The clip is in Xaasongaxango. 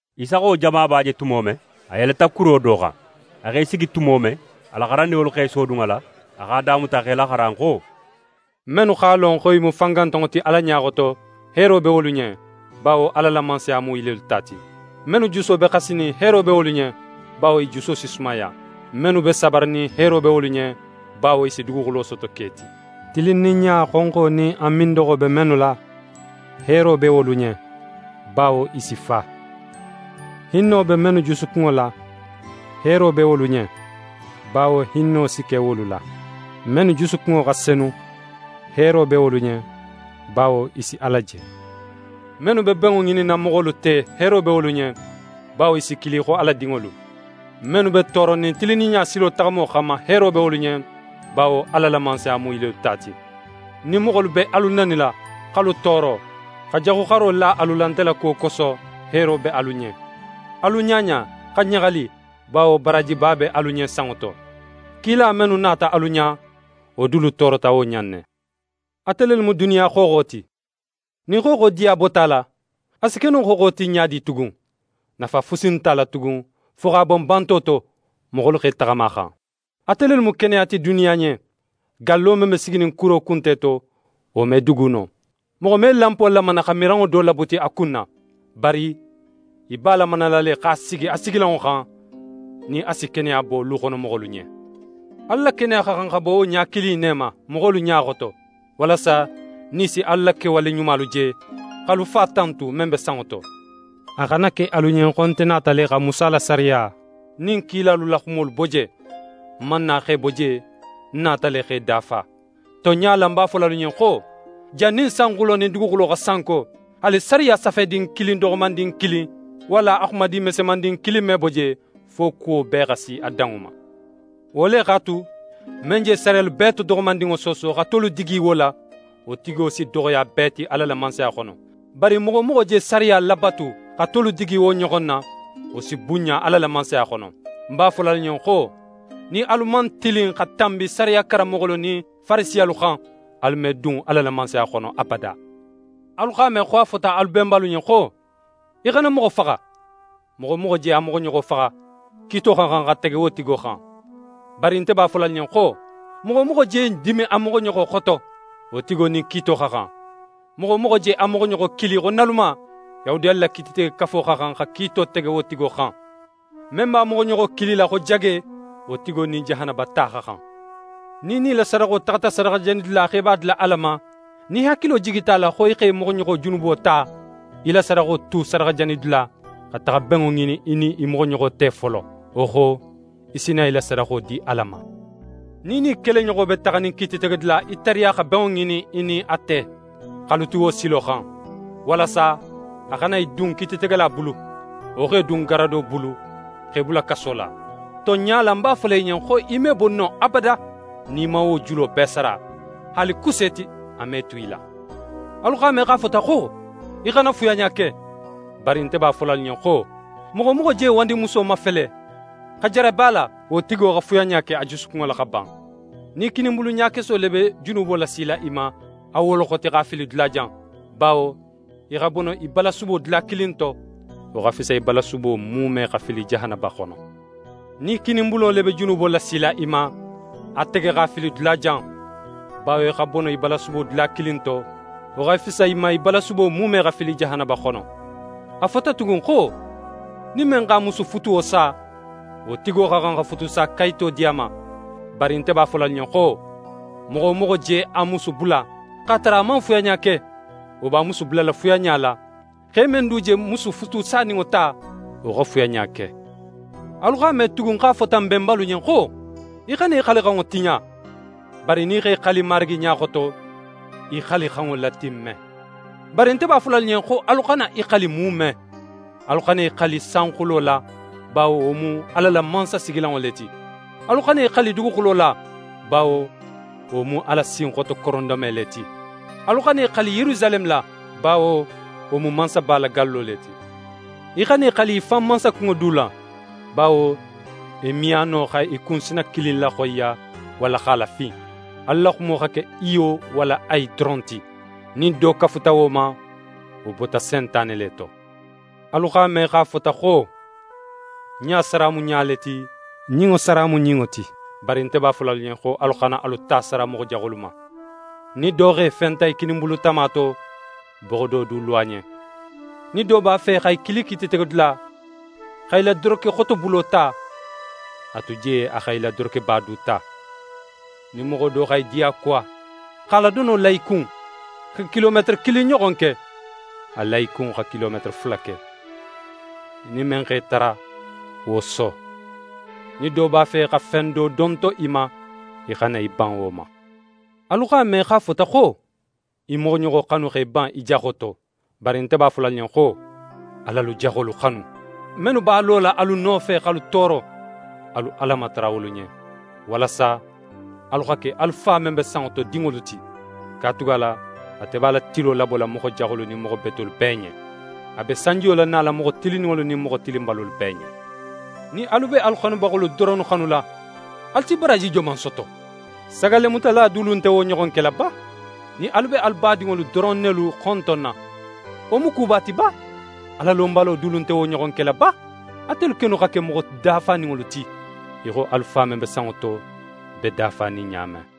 Isa xa wo jamaba je tumo men, a yeleta kuro do xan. A x'é sigi tumo men, a la xarandinŋolu x'e sodun a la. A x'a damuta x'e laxaran xo: «Mennu x'a lon xo i mu fangantanŋo ti Ala ɲa xoto, heero be wolu ɲen; bawo Ala la Mansaya mu i lelu ta ti. «Mennu juso be xasinin, heero be wolu ɲen; bawo i juso si sumaya. «Mennu be sabarinin, heero be wolu ɲen; bawo i si duguxulo soto ke ti. «Tilinninɲa xonxo nin a mindoxo be mennu la, heero be wolu ɲen; bawo i si fa. «Hinno be mennu jusukunŋo la, heero be wolu ɲen; bawo hinno si ke wolu la. «Mennu jusukunŋo xa senu, heero be wolu ɲen; bawo i si Ala je. «Mennu be benŋo ŋininna moxolu te, heero be wolu ɲen; bawo i si kili xo Ala dinŋolu. «Mennu be tooronin tilinninɲa silo taxamo xanma, heero be wolu ɲen; bawo Ala la Mansaya mu i lelu ta ti. «Nin moxolu be alu nanila, x'alu tooro, xa jaxuxaro la alu la nte la kuwo koso, heero be alu ɲen. Alu ɲaɲa, xa ɲaxali; bawo baraajiba be alu ɲen sanŋo to. Kila mennu nata alu ɲa, wo dulu toorota wo ɲa in ne. «Ate lelu mu duniya xooxo ti. Nin xooxo diya bota a la, a si ke no xooxo ti ɲa di tugun? Nafa fusi nte a la tugun fo x'a bon banto to, moxolu x'e taxama a xan. «Ate lelu mu keneya ti duniya ɲen. Gallo men be siginin kuro kunte to, wo me dugu no. Moxo me lanpo lamana xa miranŋo do labuti a kun na. Bari í b'a lamanala le x'a sigi a sigilanŋo xan, nin a si keneya bo luxonomoxolu ɲen. Alu la keneya xa xan xa bo wo ɲa kilin in ne ma moxolu ɲa xoto, walasa nin i si alu la kewale ɲumalu je, x'alu Fa tantu, men be sanŋo to. «A xana ke alu ɲen xo nte nata le xa Musa la sariya nin kilalu la xumolu bo je. Ń man na x'e bo je, ń nata le x'e dafa. Tonɲa la, ń b'a fola alu ɲen xo: Jannin sanxulo nin duguxulo xa sanko, haali sariya safedin doxomandin kilin, walla a xumadin mesemandin kilin me bo je, fo kuwo bee xa si a danŋo ma. Wo le x'a tu, men je sariyalu bee to doxomandinŋo sooso, xa tolu digi wo la, wo tigo si doxoya bee ti Ala la Mansaya xono. Bari moxo wo moxo je sariya labatu xa tolu digi wo ɲoxon na, wo si bunɲa Ala la Mansaya xono. Ń b'a fola alu ɲen xo: Nin alu man tilin xa tanbi sariya karanmoxolu nin Farisiyalu xan, alu me dun Ala la Mansaya xono abada. «Alu x'a me xo a fota alu benbalu ɲen xo: “Í xana moxo faxa. Moxo wo moxo je a moxoɲoxo faxa, kiito xa xan xa tege wo tigo xan.” Bari nte b'a fola alu ɲen xo: Moxo wo moxo je dimin a moxoɲoxo xoto, wo tigo nin kiito xa xan. Moxo wo moxo je a moxoɲoxo kili xo “naluma”, Yahudiyalu la Kiititegekafo xa xan xa kiito tege wo tigo xan. Men b'a moxoɲoxo kilila xo “jage”, wo tigo nin jahanaba ta xa xan. Nin í nin í la sadaxo taxata sadaxajanidula, xo í b'a dila Ala ma, nin í hakilo jigita a la xo í x'é moxoɲoxo junubo ta, í la sadaxo tu sadaxajanidula, xa taxa benŋo ŋinin í nin í moxoɲoxo te folo. Wo xo, í si na í la sadaxo di Ala ma. «Nin í nin í keleɲoxo be taxanin kiititegedula, í tariya xa benŋo ŋinin í nin a te, x'alu tu wo silo xan, walasa a xana í dun kiititegela bulu, wo x'é dun garado bulu x'é bula kaso la. Tonɲa la, ń b'a fola í ɲen xo í me bo non abada nin í man wo julo bee sara. Haali kuseeti, a me tu í la. «Alu x'a me xo a fota xo: “Í xana fuyanɲa ke.” Bari nte b'a fola alu ɲen xo: Moxo wo moxo je wandimuso mafele, xa jarabi a la, wo tigo xa fuyanɲa ke a jusukunŋo la xa ban. Nin í kininbulu ɲakeso le be junubo lasila í ma, a woloxoti, x'a fili dulajan; bawo í xa bono í balasubo dula kilin to, wo xa fisa í balasubo muume xa fili jahanaba xono. Nin í kininbulo le be junubo lasila í ma, a tege x'a fili dulajan; bawo í xa bono í balasubo dula kilin to, wo xa fisa í ma, í balasubo muume xa fili jahanaba xono. «A fota tugun xo: “Nin men x'a musu futuwo sa, wo tigo xa xan xa futusakayito di a ma.” Bari, nte b'a fola alu ɲen xo: Moxo wo moxo je a musu bula, x'a tara a man fuyanɲa ke, wo b'a musu bulala fuyanɲa la; xe men du je musu futusaninŋo ta, wo xa fuyanɲa ke. «Alu x'a me tugun xo a fota n benbalu ɲen xo: “Í xana í xalixanŋo tiɲa, bari nin í x'é xali Marigi ɲa xoto, í xalixanŋo latimme.” Bari nte b'a fola alu ɲen xo alu xana i xali muume. Alu xana i xali sanxulo la, bawo wo mu Ala la mansasigilanŋo le ti; alu xana i xali duguxulo la, bawo wo mu Ala sinxoto korondome le ti; alu xana i xali Yerusaleme la, bawo wo mu Mansaba la gallo le ti. Í xana í xali í fan mansakunŋo du la, bawo í me a no xa í kunsina kilin laxoyiya walla x'a lafin. Alu la xumo xa ke “iyo” walla “ayi” doron ti. Nin do kafuta wo ma, wo bota Sentane le to. «Alu x'a me xo a fota xo: “Ɲa sara mu ɲa le ti, ɲinŋo sara mu ɲinŋo ti.” Bari nte b'a fola alu ɲen xo alu xana alu ta sara moxo jaxolu ma. Nin do x'é fenta í kininbulu tama to, boxo do du lo a ɲen. Nin do b'a fe xa í kili kiititegedula, xa í la dorokexotobulo ta, a tu je a xa í la dorokeba du ta. Nin moxo do xa í diyakuwa x'a la dono la í kun, xa kilometere kilin ɲoxon ke, a la í kun xa kilometere fula ke. Nin men x'é tara, wo so. Nin do b'a fe xa fen do donto í ma, í xana í ban wo ma. «Alu x'a me xo a fota xo: “Í moxoɲoxo xanu x'é ban í jaxo to.” Bari nte b'a fola alu ɲen xo: Al'alu jaxolu xanu. Mennu b'a lola alu nofe, x'alu tooro, alu Ala matara wolu ɲen, walasa alu xa ke alu Fa men be sanŋo to dinŋolu ti. Katugala ate b'a la tilo labola moxo jaxolu nin moxo betolu bee ɲen. A be sanjiyo lanala moxo tilinninŋolu nin moxo tilinbalolu bee ɲen. Nin alu be alu xanubaxolu doronnu xanula, alu si baraaji joman soto? Sagallemutala dulu nte wo ɲoxon kela ba? Nin alu be alu badinŋolu doron nelu xontonna, wo mu kuba ti ba? Alalonbalo dulu nte wo ɲoxon kela ba? Atelu kennu xa ke moxo dafaninŋolu ti, í xo alu Fa men be sanŋo to be dafanin ɲa men.